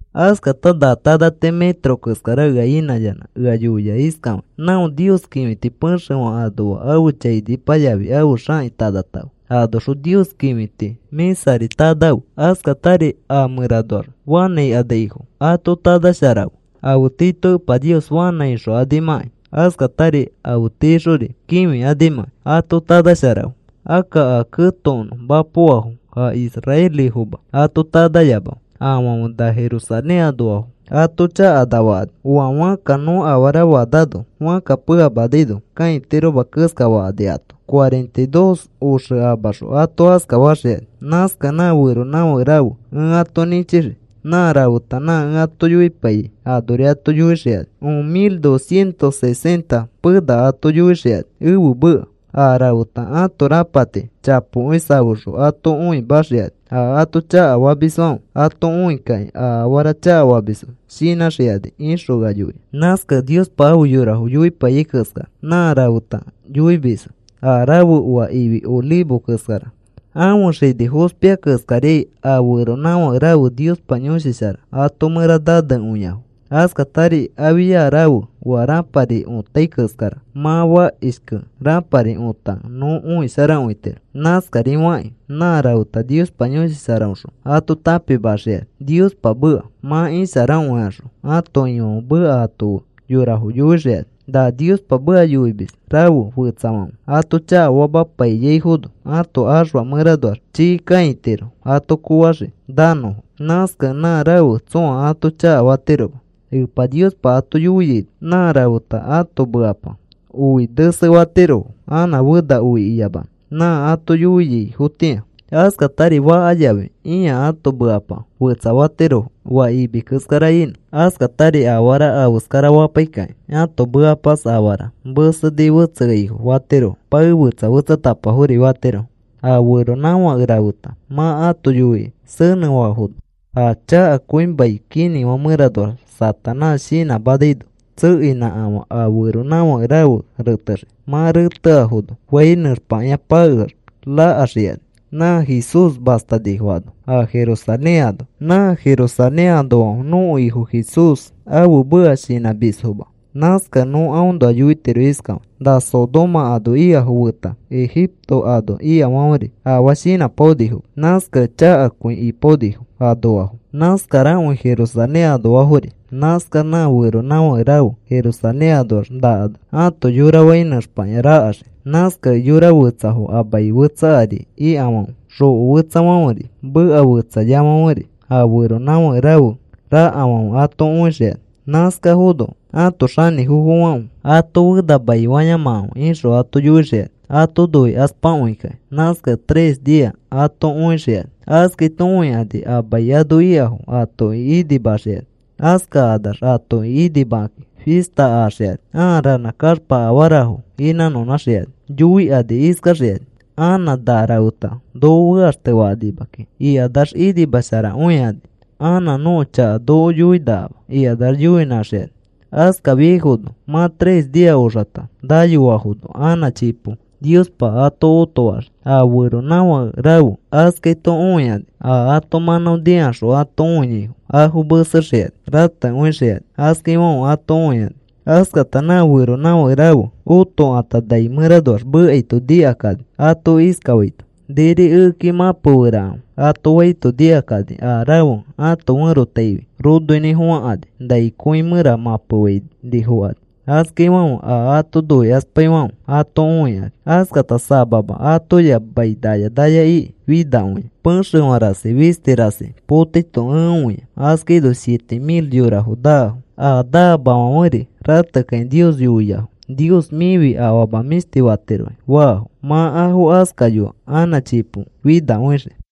Askata na tanati metro keskara ea inãyanã ea yoia iskafakĩ: “Não Nios kĩfiti pexefã anoa ãfe chainipa yafi ãfe xãki tanatãfe. Anoxõ Nios kĩfiti mĩsari tanafe. Askatari a mẽranoax fanã ikanaifo ato tanasharafe afe tiito Epa Nios fanã ixokanimãkai, askatari afe tiixori kĩfikanimãkai ato tanasharafe. Akka a ketokonõ mapoafo a israelifoma ato tanayamafe; afãfe na Jerusalén anoafo ato chakafakani oa fãkka nõ afara faanano fãkka peamanaino kãitiroma keskafakani ato. Cuarenta y dos oxe amaxõ ato askafaxikani. Nãskakẽ nã feronãfake rafe ẽ ato nĩchixii. Nã rafeta nã ẽ ato yoipaiyai anori ato yoixikani. Un mil dos cientos sesenta pena ato yoixikani ẽfe meka. A rafeta ãto rapati chapokõi safexõ ato õimaxikani. A ato chakafamisfãfe, ato õikakĩ a afara chakafamisfo shinãxikani,” ixõ ea yoia. Nãskakẽ Niospa afe yorafo yoipaiyai keskara nã rafeta yoimisfo. A rafe oa ifi olivo keskara. Ãfe xini fospia keskariai, a feronãfake rafe Niospa Yõshi Shara ato mẽra nanekõiafo. Askatari afia rafe oa rãpari õtai keskara. Mã fakishkẽ rãpari otakẽ nõ õisharakõitiro. Nãskarifakĩ nã rafeta Niospa Yõshi Sharaõxõ ato tãpimaxikani Niospa meka. Mã isharakõikaxõ ãto Ifãfe meka ato fe yorafo yoixikani. Na Niospa meka yoimis rafe fetsafãfe ato chakafapaiyaifono, ãto axfa mẽranoax chii kãitiro ato koofaxii nanõfo. Nãskakẽ nã rafe tsõa ato chakafatiroma. Epa Niospa ato yoiaino, nã rafeta ãto mekapa oi nesefatirofo anã fena oi iyamanõ nã ato yoiaifotĩa. Askatari faka yafi ĩa ãto mekapa fetsafatirofo oa imi keskara inõ. Askatari afara afeskarafapaikakĩ ãto mekapas afara meseni fetseaifo fatirofo pae fetsa fetsatapafori fatirofo. A feronãfake rafeta mã ato yoikĩ senẽfaafono, a chakakõi mai kinĩfã mẽranoax Satanás shinãmanaino, tsekeinãkafã a feronãfake rafe retexii. Mã reteafono, fãi nẽxpakĩa pakeax rakaxikani nã Jesús mastanifo ano, a Jerusalén ano. Nã Jerusalén anoafãfe nõko Ifo Jesús ãfe meka shinãmisfoma. Nãskakẽ nõ aõnoa yoitiro iskafakĩ: “Na Sodoma ano ikafo feta Egipto ano ikafãferi, afaa shinãpaonifoma. Nãskakẽ chakakõi ipaonifo anoafo. Nãskarakõi Jerusalén anoafori.” Nãskax nã feronãfake rafe Jerusalén anoax nakanax ãto yora fai nẽxpakĩa rakaxii. Nãskakẽ yora fetsafo a mai fetsa ari ikafãfe, xoko fetsafãferi, meka fetsayafãferi, a feronãfake rafe rakafãfe ato õixikani. Nãskafono ãto xanĩfofofãfe, “Ato fena maifayamakãfe,” ixõ ato yoixikani ato noikaspakõikakĩ. Nãskakẽ tres nia ato õixikani. Askaito õikani a mai ano ikafo atoki inimaxikani. Askakanax atoki inimakakĩ fista axikani. Aa ranã kaxpa afarafo inãnõnãxikani. Yoikani iskaxikani: “Anã na rafeta noko fekaxtefakanima kiki,” ikanax inimasharakõikani. “Anã nõko chaka noko yoikanima,” ikanax yoinãxikani. Askafiaifono mã tres nia oxata nayoafono anã chipo Niospa ato otofaxii a feronãfake rafe. Askaito õikani a ato mãnão nikaxõ ato õiaifo, afo mesexikani, ratekõixikani, askaifãfe ato õikani. Askata nã feronãfake rafe otokãta nai mẽranoax mekaito nikakani ato iskafaito: “Niri ekeki mãpeferakãfe,” ato faito nikakani a rafe ãto ferotaifi ronoinĩfofãkani nai kõi mẽra mãpefainifokani. Askaifãfe a ato noikaspaifãfe ato õikani. Askata samama atoya mai naya naya iki finakõia. Pexefã rasi fisti rasi potaito ẽ õia. Askaino siete mil yorafo naafo. A naamafãferi ratekakĩ Nios yoiafo, “Nios mĩfi afama mĩshti fatirokĩ,” faafo. Mã afo askayoa anã chipo finakõixii.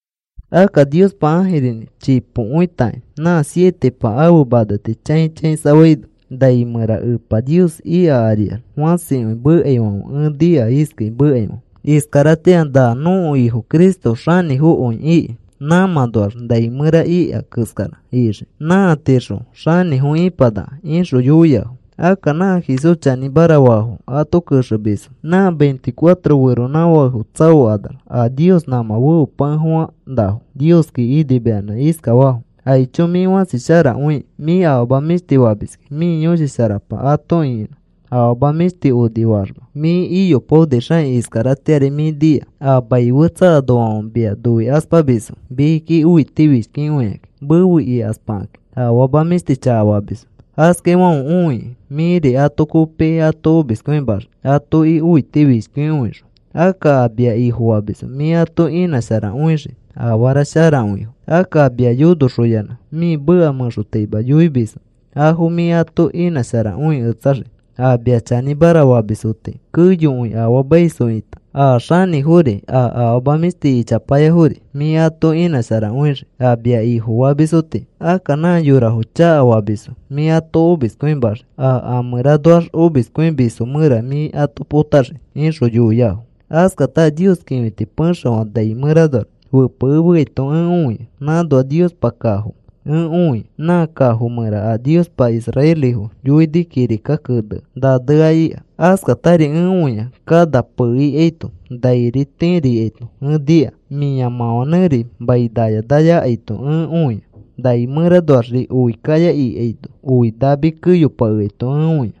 Akka Niospa ãjirinĩ chipokõitakĩ nã sietepa ãfe maneti chãi chãisafaino, nai mẽra Epa Nios ika ariax fãsikõi mekaifãfe ẽ nika iskai mekaifãfe: Iskaratĩa na nõko Ifo Cristo xanĩfokõi iki nãmãnoax nai mẽra ika keskarari ixii nãatixõ xanĩfo ĩpanaka, ixõ yoiafo. Akka nã Jesús chanĩmara faafo ato kexemisfo nã veinticuatro feronãfakefo tsaokanax a Nios nãmã feopakefofã nafo Nioski inimayanã iskafafo: ¡Aicho, mĩ fãsi sharakõiki! Mĩ afama mĩshti famiski. Mĩ Yõshi Sharapa ato ĩkinã. Afama mĩshti onifaaxma mĩ iyopaonixakĩ. Iskaratĩari mĩ nia. A mai fetsa anoafãfe mia noikaspamisfo mikiki õitifishkikõikakĩ mefe ikaspakakĩ. Afama mĩshti chakafamisfo. Askaifãfe õikĩ, mĩri ato kopikĩ ato omiskõimaxii atoki õitifishkikõixõ. Akka a mia Ifofamisfo mĩ ato inãsharakõixii afara sharakõifo. Akka a mia yonoxoyanã mĩ meka mẽxotaima yoimisfo afo mĩ ato inãsharakõiketsaxii, a mia chanĩmara famisfo tii; keyokõi afaamaisfo ita, a xanĩfori a afama mĩshti ichapayafori mĩ ato inãsharakõixii a mia Ifofamisfo tii. Akka nã yorafo chakafamisfo, mĩ ato omiskõimaxii, a amẽranoax, omiskõimisfo mẽra mĩ ato potaxii, ixõ yoiafo. Askata a Nios kĩfiti pexefã nai mẽranoax fepekemeaito ẽ õia. Nãnoa Niospa kafo ẽ õia, nã kafo mẽra a Niospa israelifo yoini kirika kenea nanea ika. Askatari ẽ õia kana pee ikaito nairi tiri ikaito ẽ nika, mĩamãfanẽri mai naya naya akaito ẽ õia, nai mẽranoaxri oi kaya ikaino, oi nami keyopakeaito ẽ õia.